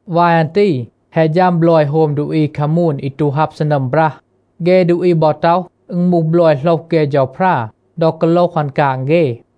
วาย อัน ตี แฮะ ฌัม บลอย โฮม ดูอี คามูน อี ตู ฮับ ซีนัม บรัห. เฆ ดูอี บอ ต็อห, อึณ มูห บลอย โหลห เฆ เฌาพรา ดอ กาโลห อัน กาง เฆ.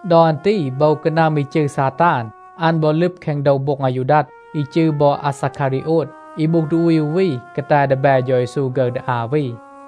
ดอ อัน ตี โบว กานัม อี จืร ซาตาน, อัน บอ ลึบ แคง โดว โบ็ง อายูดัด, อี จืร บอ อาซาคารีโอด, อี มูห ดูอี อู วี กาแต ดีแบ เฌา เยซู ฆึร ดี อา วี.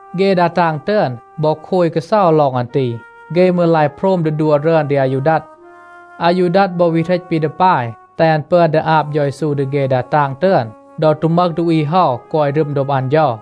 เฆ ดา ตาง ตึอน บอ โคย กาเซา ลอง อัน ตี. เฆ มืร ลาย โพรม ดี ดัว รึอน ดี อายูดัด. อายูดัด บอ วี เหรต ปี ดี ปาย แตห อัน ปึอน ดี อาบ เฌา เยซู ดี เฆ ดา ตาง ตึอน ดอ ตู มึห ดูอี เฮา กอย รึม โดบ อัน เฌา.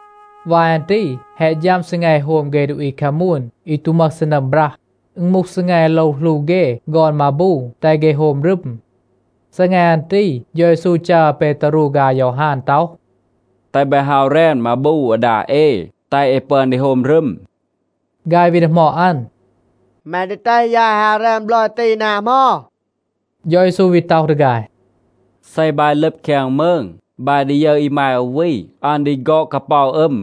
วาย อัน ตี แฮะ ฌัม ซีแง โฮม เฆ ดูอี คามูน อี ตู มึห ซีนัม บรัห. อึณ มูห ซีแง โลว หลู เฆ ฆอน มาบู, แตห เฆ โฮม รึม. ซีแง อัน ตี, เฌา เยซู จัร อาเปตารู ฆาย อายอฮาน ต็อห, “แตห บาย ฮาว แรน มาบู อาดา เอ, แตห เอ ปึอน ดี โฮม รึม.” ฆาย วี ดีหมอด อัน, “แม ดี แตห ยาย ฮาว แรน บลอย ตี นา เหมา?” เฌา เยซู วี ต็อห ดี ฆาย, “เซ บาย ลึบ แคง มืง, บาย ดี ยึร อีมาย อู วี, อัน ดี ฆอด กาเปา อึม.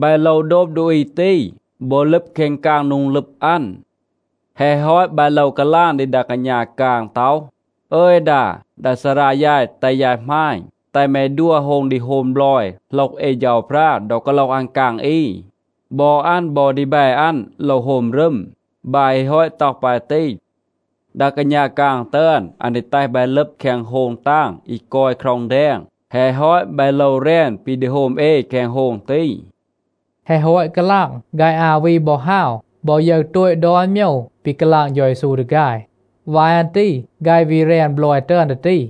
บาย โลว โดบ ดูอี ตี, บอ ลึบ แคง กาง โดง ลึบ อัน. แฮะ ฮอต บาย โลว กาลาง ดี ดา กาณา กาง ต็อห, ‘อึย ดา, ดา ซารา ยาย แตห ยาย หมาณ, แตห แม ดัว โฮง ดี โฮม บลอย โหลห เอ เฌาพรา ดอ กาโลห อัน กาง อี. บอ อัน บอ ดีแบ อัน โลว โฮม รึม.’ บาย ฮี ฮอต ต็อห ปาย ตี, ดา กาณา กาง ตึอน, อัน ดี แตห บาย ลึบ แคง โฮง ตาง อี กอย คร็อง แดง. แฮะ ฮอต, บาย โลว แรน ปี ดี โฮม เอ แคง โฮง ตี.” แฮะ ฮอต กาลาง, ฆาย อา วี บอ ฮาว บอ ยึร โตต ดอน โมยว ปี กาลาง เฌา เยซู ดี ฆาย. วาย อัน ตี ฆาย วี แรน บลอย ตึอน ดี ตี.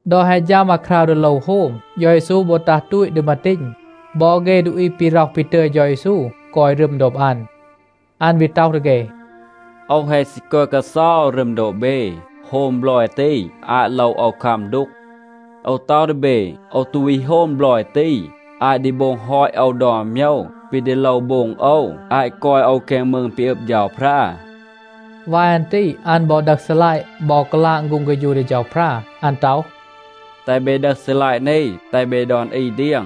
ดอ แฮะ ฌัม อาคราว ดี โลว โฮม, เฌา เยซู บอ ตัห ตูต ดี มาตีณ. บอ เฆ ดูอี ปี ร็อห ปี ตึย เฌา เยซู กอย รึม โดบ อัน. อัน วี ต็อห ดี เฆ, “โอว แฮะ ซี กอย กาเซา รึม โดบ เบ, โฮม บลอย ตี อาต โลว คัม โอว ดูก. โอว ต็อห ดี เบ, โอว ตู วี โฮม บลอย ตี อาต ดี โบง ฮอต โอว ดอน โมยว ปี ดี โลว โบง โอว, อาต กอย โอว แคง มืง ปี อึบ เฌาพรา.” วาย อัน ตี อัน บอ ดึห ซีลัยะ, บอ กาลาง ฆูง เฆฌู ดี เฌาพรา. อัน ต็อห, “แตห เบ ดึห ซีลัยะ นี. แตห เบ ดอน อี เดียง.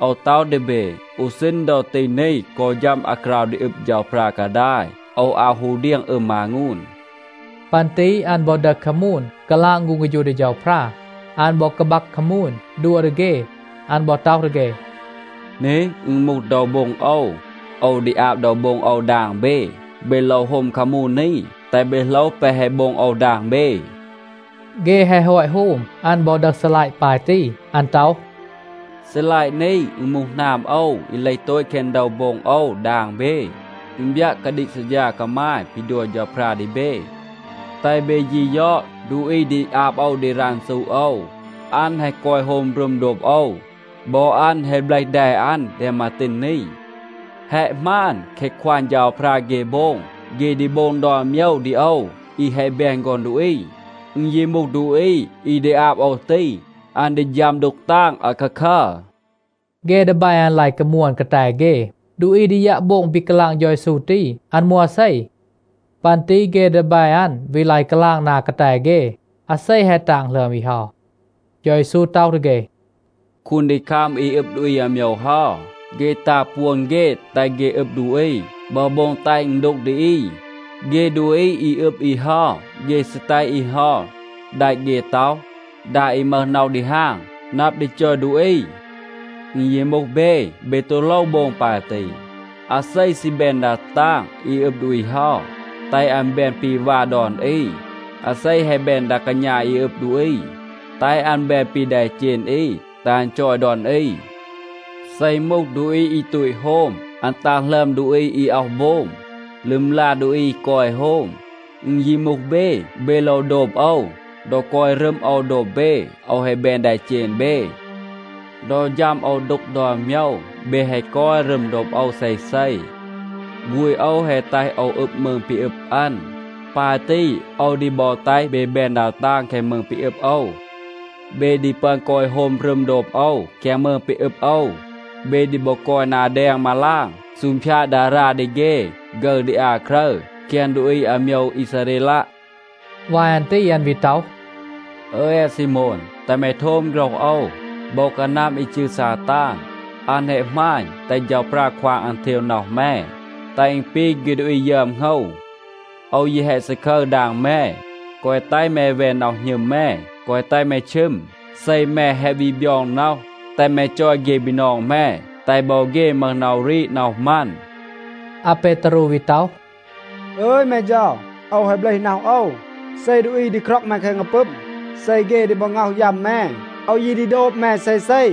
โอว ต็อห ดี เบ, อู ซีณ ดอ ตี นี, กอ ฌัม อาคราว ดี อึบ เฌาพรา กาดาย, โอว อาว ฮู เดียง อึม มางูน.” ปัน ตี อัน บอ ดึห คามูน, กาลาง ฆูง เฆฌู ดี เฌาพรา. อัน บอ กาบัก คามูน, ดัว ดี เฆ. อัน บอ ต็อห ดี เฆ, “นี, อึณ มูห โดว โบ็ง โอว. โอว ดี อาบ โดว โบ็ง โอว ดาง เบ. เบ โลว โฮม คามูน นี, แตห เบ โหลห แปะ แฮะ โบง โอว ดาง เบ.” เฆ แฮะ ฮอต โฮม, อัน บอ ดึห ซีลัยะ ปาย ตี. อัน ต็อห, “ซีลัยะ นี, อึณ มูห หนาม โอว อี เลห โตต แคง โดว โบ็ง โอว ดาง เบ. อึณ บยัะ กาดีก ซัดฌา กามาย ปี ดัว เฌาพรา ดี เบ. แตห เบ ยี ยอด, ดูอี ดี อาบ โอว ดี รันซู โอว, อัน แฮะ กอย โฮม รึม โดบ โอว. บอ อัน แฮะ เบลห แด อัน แดง มาตีณ นี. แฮะ หมาน, แคะ ควาง เฌาพรา เฆ โบง, เฆ ดี โบง ดอน โมยว ดี โอว อี แฮะ แบน ฆอน ดูอี. อึณ ยี มูห ดูอี อี ดี อาบ โอว ตี, อัน ดี ฌัม ดูก ตาง อาคาคัร.” เฆ ดีแบ อัน ลาย กามวน กาแต เฆ, ดูอี ดี ยัะ โบง ปี กาลาง เฌา เยซู ตี, อัน มูห อาเซ. ปัน ตี เฆ ดีแบ อัน วี ลาย กาลาง นา กาแต เฆ, อาเซ แฮะ ตาง หลึอม อี เฮา. เฌา เยซู ต็อห ดี เฆ, “คูนดีคัม อี อึบ ดูอี อาโมยว เฮา, เฆ ตา ปวน เฆ แตห เฆ อึบ ดูอี บอ โบง แตห อึณ ดูก ดี อี. เฆ ดูอี อี อึบ อี เฮา, เฆ ซี แตห อี เฮา แดะ เฆ ต็อห ‘ดา อี มึห น็อห ดีฮาง, นับ ดี จอย ดูอี.’ อึณ ยี มูห เบ, เบ ตู โลว โบง ปาย ตี. อาเซ ซี แบน ดา ตาง อี อึบ ดูอี เฮา, แตห อัน แบน ปี วา ดอน อี. อาเซ แฮะ แบน ดา กาณา อี อึบ ดูอี, แตห อัน แบน ปี แดเจณ อี, แตห อัน จอย ดอน อี. เซ อึณ มูห ดูอี อี ตูต โฮม, อัน ตาง หลึอม ดูอี อี อ็อห โบม บอ ลึมลา ดูอี อี กอย โฮม. อึณ ยี มูห เบ, เบ โลว โดบ โอว. ดอ กอย รึม โอว โดบ เบ, โอว แฮะ แบน แดเจณ เบ. ดอ ฌัม โอว ดูก ดอน โมยว เบ แฮะ กอย รึม โดบ โอว เซเซ. ฆูณ โอว แฮะ แตห โอว อึบ มืง ปี อึบ อัน. ปาย ตี, โอว ดี บอ แตห เบ แบน ดา ตาง แคง มืง ปี อึบ โอว. เบ ดี ปึอน กอย โฮม รึม โดบ โอว แคง มืง ปี อึบ โอว. เบ ดี บอ กอย นา แดง มาลาง, ซูงพยาด ดารา ดี เฆ ฆึร ดี อา ครึร แคง ดูอี อาโมยว อีซาเรลัะ.” วาย อัน ตี อัน วี ต็อห, “อึย อาซีโมน, แตห แม โทม โฆรห โอว. โบว กานัม อี จืร ซาตาน, อัน แฮะ หมาณ, แตห เฌาพรา ควาง อัน เทว น็อห แม, แตห อึณ ปี เฆ ดูอี ยึอม โหงว. โอว ยี แฮะ ซาคึร ดาง แม, แกวะ แตห แม แวน น็อห หณึม แม, แกวะ แตห แม ชึม. เซ แม แฮะ วี บยอง น็อห, แตห แม จอย เฆ บีนอง แม, แตห บอ เฆ มึห น็อห รีด น็อห มัน.” อาเปตารู วี ต็อห, “อึย แม เฌา, โอว แฮะ เบลห น็อห โอว, เซ ดูอี ดี คร็อง แม แคง กาปึม, เซ เฆ ดี บอ ง็อห ยัม แม, โอว ยี ดี โดบ แม เซเซ.”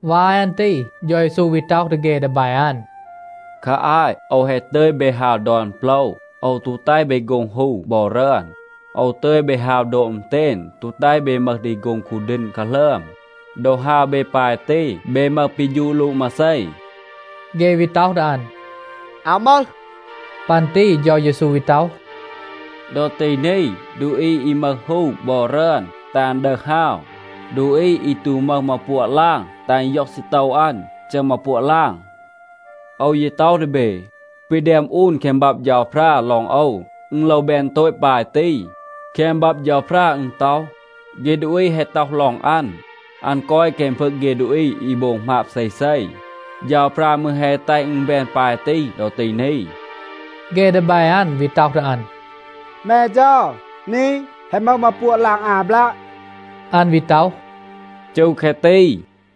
วาย อัน ตี เฌา เยซู วี ต็อห ดี เฆ ดีแบ อัน, “คา อาต โอว แฮะ ตึย เบ ฮาว ดอน โปละ, โอว ตู แตห เบ โฆ็ง ฮู บอ รึอน. โอว ตึย เบ ฮาว โดบ อึณเตณ, ตู แตห เบ มึห ดี โฆ็ง คูดีณ กาหลึอม. ดอ ฮาว เบ ปาย ตี, เบ มึห ปี ฌูด ลูด มาเซ?” เฆ วี ต็อห ดี อัน, “อาว มึห.” ปัน ตี เฌา เยซู วี ต็อห, “ดอ ตี นี, ดูอี อี มึห ฮู บอ รึอน, แตห อัน ดึห ฮาว. ดูอี อี ตู มึห มา ปัวะ ลาง, แตห อัน ย็อง ซีโตว อัน, จึห มา ปัวะ ลาง. โอว ยี ต็อห ดี เบ, ปี แดม อูน แคง บับ เฌาพรา ลอง โอว, อึณ โลว แบน โตต ปาย ตี. แคง บับ เฌาพรา อึณ ต็อห, ‘เฆ ดูอี แฮะ ต็อห ลอง อัน, อัน กอย แคง พึง เฆ ดูอี อี โบง หมาบ เซเซ.’ เฌาพรา มืร แฮะ แตห อึณ แบน ปาย ตี ดอ ตี นี.” เฆ ดีแบ อัน วี ต็อห ดี อัน, “แม เฌา, นี, แฮะ มึห มาปัวะ ลาง อา บลัะ.” อัน วี ต็อห, “จู แคะ ตี.”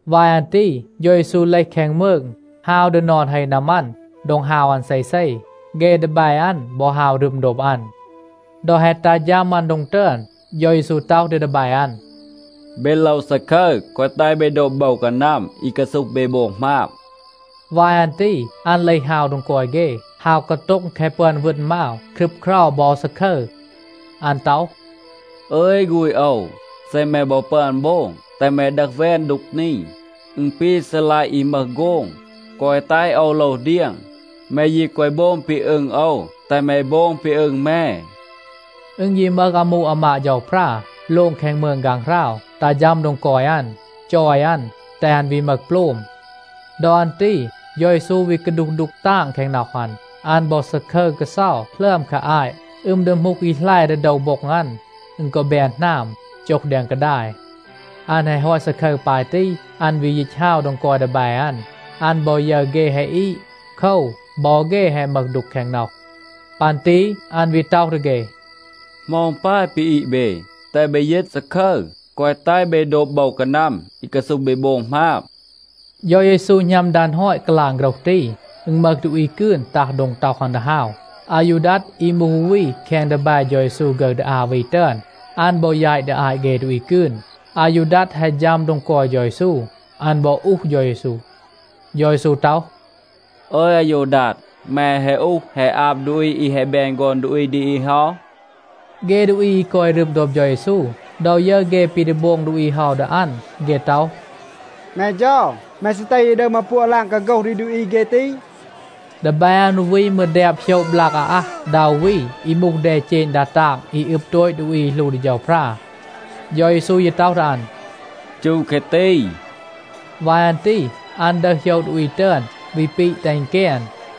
วาย อัน ตี เฌา เยซู เลห แคง มืง, ฮาว ดี นอน เฮ นามัน, โดง ฮาว อัน เซเซ. เฆ ดีแบ อัน บอ ฮาว รึม โดบ อัน. ดอ แฮะ ตัห ฌัม อัน โดง ตึอน, เฌา เยซู ต็อห ดี ดีแบ อัน, “เบ โลว ซาคึร, แกวะ แตห เบ โดบ โบว กานัม อี กาซูห เบ โบง หมาบ.” วาย อัน ตี อัน เลห ฮาว โดง กอย เฆ, ฮาว กาโต็ง แคะ ปึอน วึณ มาว, ครึบเครา บอ ซาคึร. อัน ต็อห, “อึย ฆูณ โอว, เซ แม บอ ปึอน โบง, แตห แม ดึห แวน ดูก นี. อึณ ปี ซีลัยะ อี มึห โฆง. แกวะ แตห โอว โลว เดียง. แม ยี แกวะ โบง ปี อึง โอว, แตห แม โบง ปี อึง แม.” อึณ ยี มึห อามู อามาด เฌาพรา โลง แคง มืง ฆางหราว ตัห ฌัม โดง กอย อัน, จอย อัน, แตห อัน วี มึห โปลม. ดอ อัน ตี เฌา เยซู วี กาดูห ดูก ตาง แคง น็อห อัน. อัน บอ ซาคึร กาเซา หลึอม คา อาต. อึม ดีหมูห อี แหล ดี โดว โบ็ง อัน, อึณ กอ แบน หนาม, โจห แดง กาดาย.a อัน แฮะ ฮอต ซาคึร ปาย ตี, อัน วี ยีต ฮาว โดง กอย ดีแบ อัน. อัน บอ ยึร เฆ แฮะ อีด. โคว, บอ เฆ แฮะ มึห ดูก แคง น็อห. ปัน ตี อัน วี ต็อห ดี เฆ, “เหมา อึณ ปาย ปี อีด เบ? แตห เบ ยีต, ซาคึร, แกวะ แตห เบ โดบ โบว กานัม อี กาซูห เบ โบง หมาบ.” เฌา เยซู หณัม ดัน ฮอต กาลาง โฆรห ตี, อึณ มึห ดูอี กืน ตัห โดง ต็อห อัน ดี ฮาว. อายูดัด อี มูห อู วี แคง ดีแบ เฌา เยซู ฆึร ดี อา วี ตึอน, อัน บอ แยต ดี อาต เฆ ดูอี กืน. อายูดัด แฮะ ฌัม โดง กอย เฌา เยซู, อัน บอ อูห เฌา เยซู. เฌา เยซู ต็อห, “อึย อายูดัด, แม แฮะ อูห แฮะ อาบ ดูอี อี แฮะ แบน ฆอน ดูอี ดี อี เฮา?” เฆ ดูอี อี กอย รึม โดบ เฌา เยซู, ดอ ยึร เฆ ปี ดี โบง ดูอี เฮา ดี อัน, เฆ ต็อห, “แม เฌา, แม ซี แตห เย ดึห มาปัวะ ลาง, กาโฆห ดี ดูอี เฆ ตี?” ดีแบ อัน อู วี มืร แดบ โหยะ บลาก อาอัห ดา อู วี อี มูห แดเจณ ดา ตาง อี อึบ โตต ดูอี อี หลู ดี เฌาพรา. เฌา เยซู ยี ต็อห ดี อัน, “จู แคะ ตี.” วาย อัน ตี อัน ดึห โหยะ ดูอี ตึอน วี ปีะ แตห อึณ แกน.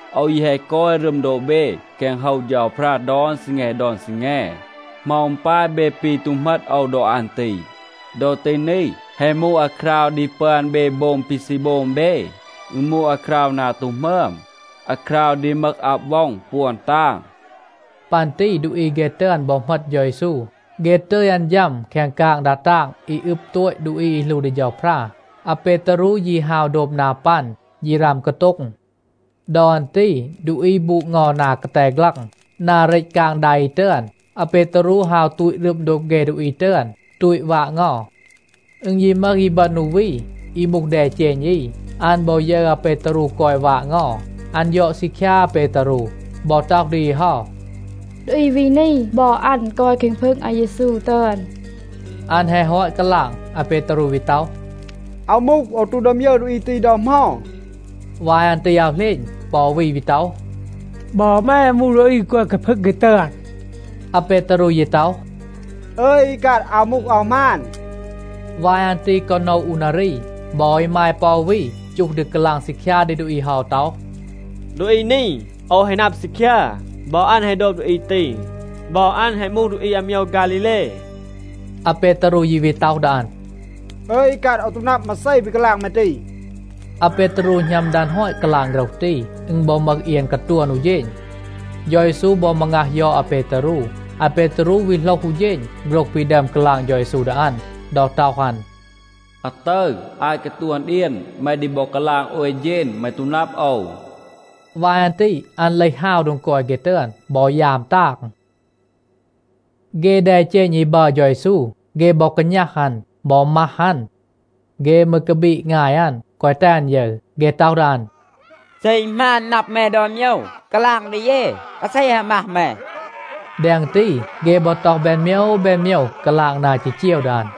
โอว ยี แฮะ กอย รึม โดบ เบ แคง โฮว เฌาพรา ดอน ซีแง ดอน ซีแง. เหมา อึณ ปาย เบ ปี ตู เหมต โอว ดอ อัน ตี? ดอ ตี นี, แฮะ มูห อาคราว ดี ปึอน เบ โบง ปี ซี โบง เบ. อึณ มูห อาคราว นา ตู หมึอม, อาคราว ดี มึห อับ ว็อง ปวน ตาง.” ปัน ตี ดูอี เฆ ตึอน บอ เหมต เฌา เยซู. เฆ ตึย อัน ฌัม แคง กาง ดา ตาง อี อึบ โตต ดูอี อี หลู ดี เฌาพรา. อาเปตารู ยี ฮาว โดบ นา ปัน ยี ราม กาโต็ง. ดอ อัน ตี ดูอี บูด เงา นา กาแต ฆลัง นา เรต กาง ดา อี ตึอน. อาเปตารู ฮาว ตูต รึม โดบ เฆ ดูอี ตึอน, ตูต วาด เงา. อึณ ยี มึห อีบึณ อู วี อี มูห แดเจณ อี. อัน บอ ยึร อาเปตารู กอย วาด เงา, อัน ยอด ซีคยา อาเปตารู บอ ต็อห ดี อี เฮา, “ดูอี วี นี, บอ อัน กอย แคง พึง อาเยซู ตึอน.” อัน แฮะ ฮอต กาลาง, อาเปตารู วี ต็อห, “อาว มูห, โอว ตู ดึอม ยึร ดูอี ตี ดอ เหมา.” วาย อัน ตี อาว เหลณ, ปอ อู วี ต็อห, “บอ แม มูห ดูอี อี กอย แคง พึง เฆ ตึอน.” อาเปตารู ยี ต็อห, “อึย อีกัด, อาว มูห, อาว หมาน.” วาย อัน ตี กอ โนะ อู นารี, บอ อีมาย ปอ อู วี จูห ดี กาลาง ซีคยา ดี ดูอี เฮา ต็อห, “ดูอี นี, โอว แฮะ นับ ซีคยา, บอ อัน แฮะ โดบ ดูอี ตี. บอ อัน แฮะ มูห ดูอี อาโมยว ฆาลีเล.” อาเปตารู ยี วี ต็อห ดี อัน, “อึย อีกัด, โอว ตู นับ มาเซ ปี กาลาง แม ตี.” อาเปตารู หณัม ดัน ฮอต กาลาง โฆรห ตี, อึณ บอ มึห เอียน กาตวน อู เฌณ. เฌา เยซู บอ มางัห ยอด อาเปตารู. อาเปตารู วี โหลห อู เฌณ โฆรห ปี ดึอม กาลาง เฌา เยซู ดี อัน, ดอ ต็อห อัน, “อาตึร, อาต กาตวน เอียน, แม ดี บอ กาลาง โอย เฌณ, แม ตู นับ โอว.” วาย อัน ตี อัน เลห ฮาว โดง กอย เฆ ตึอน บอ ยาม ตาง. เฆ แดเจณ อี บัร เฌา เยซู, เฆ บอ กาณัห อัน, บอ มัห อัน. เฆ มืร กาบีด งาย อัน, แกวะ แตห อัน ยึร. เฆ ต็อห ดี อัน, “เซ อึณ หมาน นับ แม ดอน โมยว, กาลาง ดี เย, อาเซ แฮะ มัห แม.” แดง ตี, เฆ บอ ต็อห แบน โมยว แบน โมยว, กาลาง นา จีจีว ดี อัน.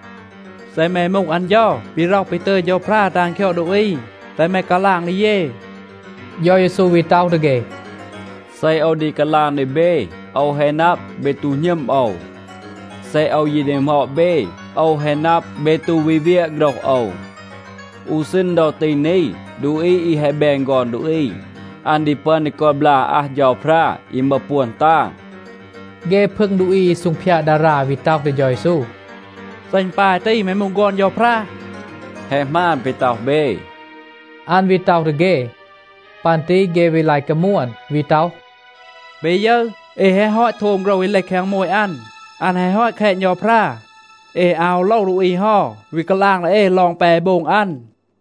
“เซ แม มูห อัน เฌา ปี ร็อห ปี ตึย เฌาพรา แตห อัน คยอด ดูอี, แตห แม กาลาง ดี เย.” เฌา เยซู วี ต็อห ดี เฆ, “เซ โอว ดี กาลาง ดี เบ, โอว แฮะ นับ, เบ ตู หณึม โอว. เซ โอว ยี ดีหมอด เบ, โอว แฮะ นับ, เบ ตู วี เวียะ โฆรห โอว. อู ซีณ ดอ ตี นี, ดูอี อี แฮะ แบน ฆอน ดูอี, อัน ดี ปึอน ดี กอย บลาก อาอัห เฌาพรา, อี มึห ปวน ตาง.” เฆ พึง ดูอี อี ซูงพยาด ดารา วี ต็อห ดี เฌา เยซู, “เซ อึณ ปาย ตี, แม มูห ฆอน เฌาพรา?” “แฮะ หมาน ปี ต็อห เบ,” อัน วี ต็อห ดี เฆ. ปัน ตี เฆ วี ลาย กามวน, วี ต็อห, “เบ ยึร, เอ แฮะ ฮอต โทม โฆรห อี เลห แคง โมต อัน. อัน แฮะ ฮอต แคณ เฌาพรา. เอ อาว ฮู โลว ดูอี เฮา วี กาลาง ดี เอ ลอง แปะ แฮะ โบง อัน.”